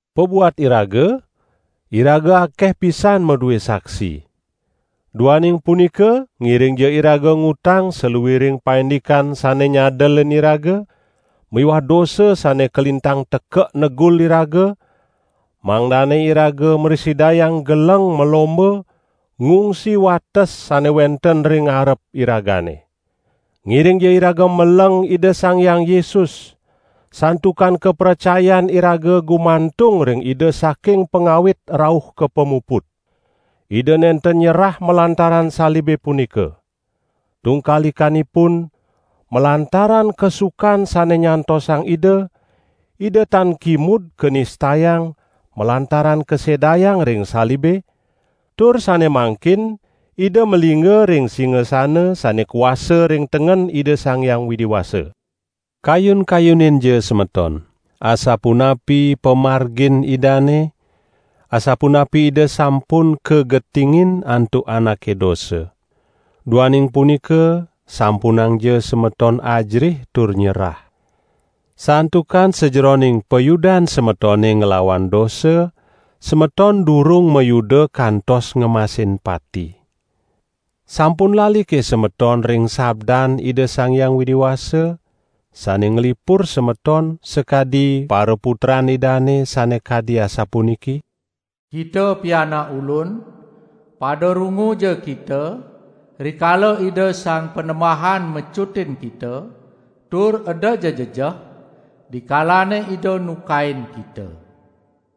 Pabuat iraga, iraga akeh pisan madue saksi. Duaning punika ngiringja iraga ngutang saluiring paindikan sane nyadelin iraga miwah dosa sane kalintang tekek negul iraga, mangdane iraga mrasidayang geleng malomba ngungsi wates sane wenten ring arep iragane. Ngiringja iraga meleng Ida Sang Hyang Yesus, santukan kapracayan iraga gumantung ring Ida saking pangawit rauh ka pamuput. Ida nenten nyerah malantaran salibe punika. Tungkalikanipun, malantaran kasukan sane nyantosang Ida, Ida tan kimud kanistayang malantaran kasedayang ring salibe, tur sane mangkin Ida malingga ring singasana sane kuasa ring tengen Ida Sang Hyang Widi Wasa. Kayun-kayuninja semeton, asapunapi pamargin Idane, asapunapi Ida sampun kagetingin antuk anake dosa. Duaning punika sampunangja semeton ajerih tur nyerah. Santukan sajeroning payudan semetone nglawan dosa, semeton durung mayuda kantos ngemasin pati. Sampun lalike semeton ring sabdan Ida Sang Hyang Widi Wasa, sane nglipur semeton sakadi paraputran Idane, sane kadi asapuniki: "Kita pianak Ulun, pada runguja kita rikala Ida Sang Panembahan mecutin kita tur edaja jejeh, dikalane Ida nukain kita.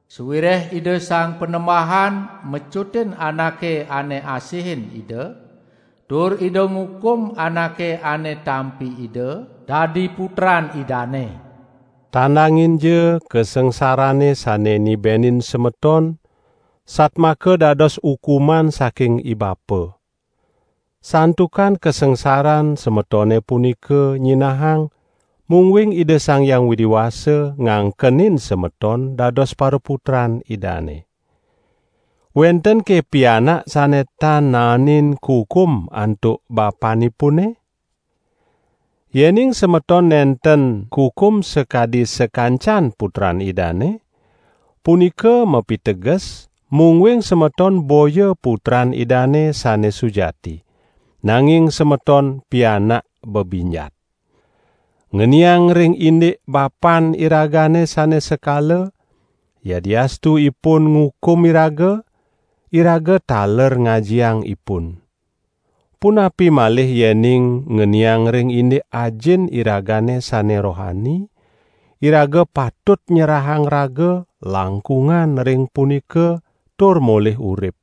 Sawireh Ida Sang Panembahan mecutin anake ane asihin Ida, tur Ida ngukum anake ane tampi Ida dadi Putran Idane." Tandanginja kasangsarane sane nibenin semeton satmaka dados ukuman saking ibapa. Santukan kasangsaran semetone punika nyinahang, mungguing Ida Sang Hyang Widi Wasa ngangkenin semeton dados paraputran Idane. Wentenke pianak sane tan naenin kukum antuk bapanipune? Yening semeton nenten kukum sakadi sakancan putran Idane, punika mapiteges, mungguing semeton boya putran Idane sane sujati, nanging semeton pianak bebinjat. Ngeniang ring indik bapan iragane sane sekala, yadiastu ipun ngukum iraga, iraga taler ngajiang ipun. Punapi malih yening ngeniang ring indik Ajin iragane sane rohani, iraga patut nyerahang raga langkungan ring punika tur molih urip.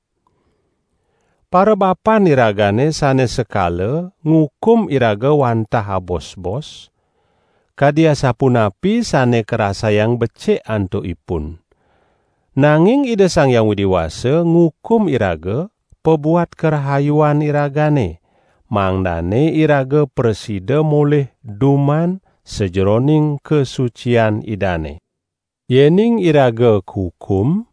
Parabapan iragane sane sekala ngukum iraga wantah abosbos, kadi asapunapi sane karasayang becik antukipun. Nanging Ida Sang Hyang Widi Wasa ngukum iraga pabuat karahayuan iragane, mangdane iraga prasida molih duman sajeroning kasucian Idane. Yening iraga kukum,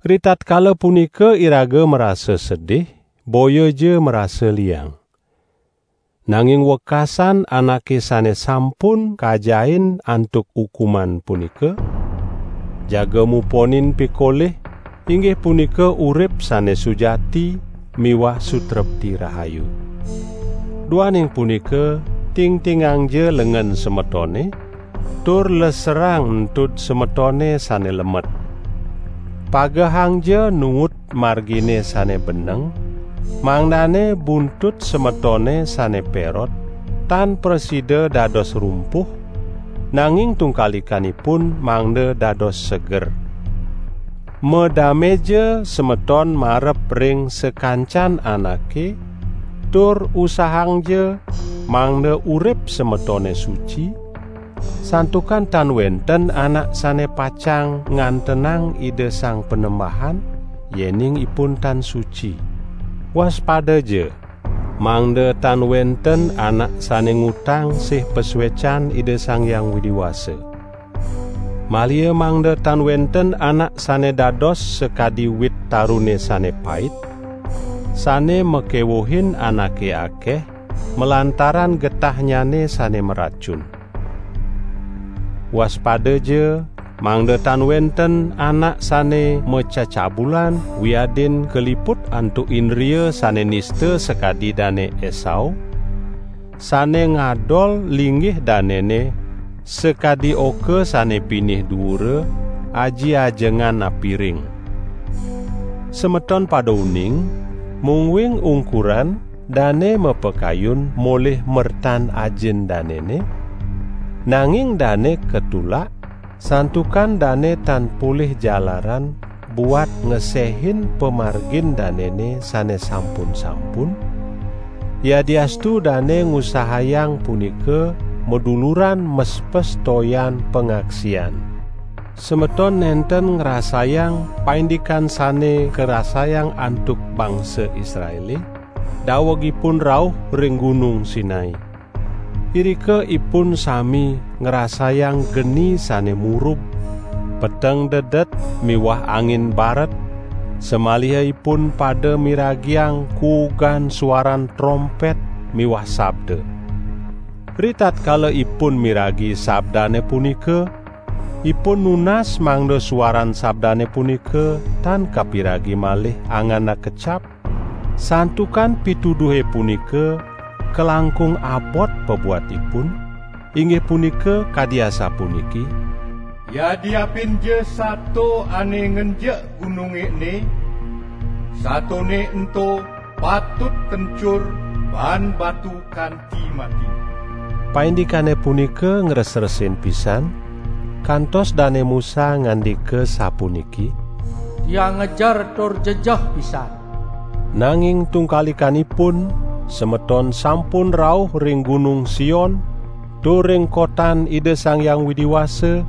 ritatkala punika iraga marasa sedih, boyaja marasa liang. Nanging wekasan anake sane sampun kajahin antuk ukuman punika, jaga muponin pikolih, inggih punika urip sane sujati miwah sutrepti rahayu. Duaning punika tingtingangja lengen semetone tur leserang entud semetone sane lemet. Pagehangja nuut margine sane beneng, mangdane buntut semetone sane perot tan prasida dados rumpuh, nanging tungkalikanipun mangda dados seger. Madameja semeton marep ring sakancan anake tur usahangja mangda urip semetone suci, santukan tan wenten anak sane pacang ngantenang Ida Sang Panembahan yening ipun tan suci. Waspadaja, mangda tan wenten anak sane ngutang sih pasuecan Ida Sang Hyang Widi Wasa. Maliha mangda tan wenten anak sane dados sakadi wit tarune sane pait, sane makewuhin anake akeh malantaran getahnyane sane maracun. Waspadaja, mangda tan wenten anak sane macecabulan wiadin kaliput antuk indria sane nista sakadi Dane Esau, sane ngadol linggih danene sakadi oka sane pinih duura, aji ajengan apiring! Semeton pada uning, mungguing ungkuran dane mapakayun molih mertan ajin danene, nanging dane katulak, santukan dane tan polih jalaran buat ngesehin pamargin danene sane sampun-sampun, yadiastu dane ngusahayang punika maduluran mespes toyan pangaksian. Semeton nenten ngrasayang paindikan sane karasayang antuk bangsa Israele, daweg ipun rauh ring Gunung Sinai. Irika ipun sami ngrasayang geni sane murub, peteng dedet miwah angin baret, samaliha ipun pada miragiang kuugan suaran trompet miwah sabda. Ritatkala ipun miragi sabdane punika, ipun nunas mangda suaran sabdane punika tan kapiragi malih angan akecap, santukan pituduhe punika kalangkung abot pabuat ipun, inggih punika kadi asapuniki: "Yadiapinja sato ane ngenjek gununge ene, satone ento patut kencur baan batu kanti mati." Paindikane punika ngresresin pisan, kantos Dane Musa ngandika sapuniki: "Tiang ngejer tur jejeh pisan!" Nanging tungkalikanipun semeton sampun rauh ring Gunung Sion tur ring kotan Ida Sang Hyang Widi Wasa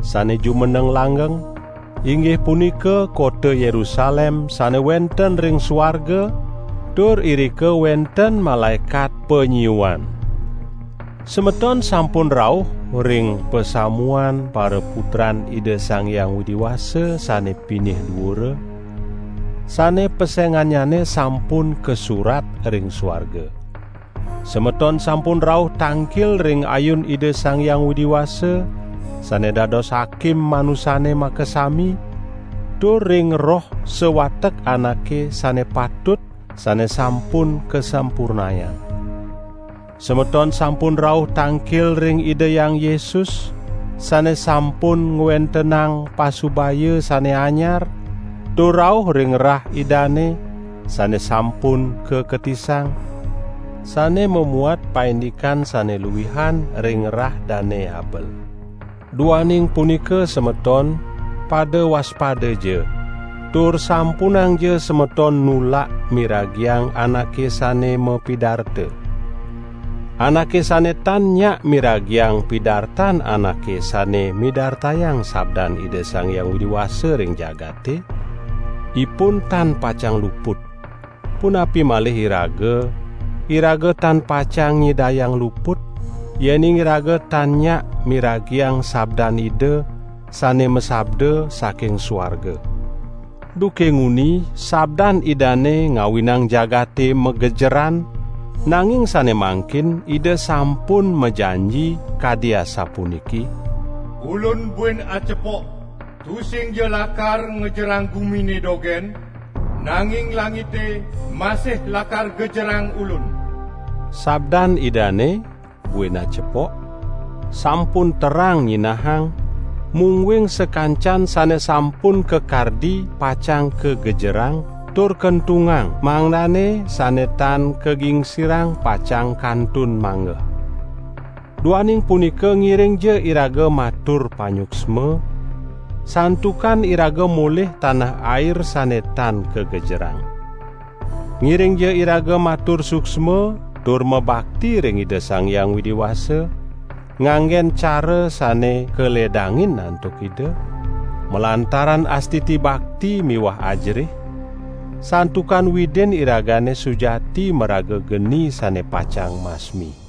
sane jumeneng langgeng, inggih punika kota Yerusalem sane wenten ring suarga tur irika wenten malaekat panyiuan. Semeton sampun rauh ring pasamuan paraputran Ida Sang Hyang Widi Wasa sane pinih duura, sane pesengannyane sampun kasurat ring suarga. Semeton sampun rauh tangkil ring ayun Ida Sang Hyang Widi Wasa, sane dados Hakim manusane makasami, tur ring roh sawatek anake sane patut sane sampun kasampurnayang. Semeton sampun rauh tangkil ring Ida Hyang Yesus, sane sampun ngwentenang pasubaya sane anyar, tur rauh ring rah Idane, sane sampun kaketisang, sane mamuat paindikan sane luihan ring rah Dane Habel. Duaning punika semeton, pada waspadaja, tur sampunangja semeton nulak miragiang anake sane mapidarta. Anake sane tan nyak miragiang pidartan anake sane midartayang sabdan Ida Sang Hyang Widi Wasa ring jagate, ipun tan pacang luput. Punapi malih iraga, iraga tan pacang nyidayang luput, yening iraga tan nyak miragiang sabdan Ida, sane masabda saking suarga. Duke nguni sabdan Idane ngawinang jagate magejeran, nanging sane mangkin Ida sampun majanji, kadi asapuniki: "Ulun buin acepok, tusingja lakar ngejerang gumine dogen, nanging langite masih lakar gejerang Ulun." Sabdan Idane "buin acepok" sampun terang nyinahang, mungguing sakancan sane sampun kakardi pacang kagejerang tur kentungang mangdane sane tan kagingsirang pacang kantun manggeh. Duaning punika ngiringja iraga matur panyuksma, santukan iraga molih tanah air sane tan kagejerang. Ngiringja iraga matur suksma tur mabakti ring Ida Sang Hyang Widi Wasa, nganggen cara sane kaledangin antuk Ida, malantaran astiti bakti miwah ajerih; santukan Widin iragane sujati maraga geni sane pacang masmi.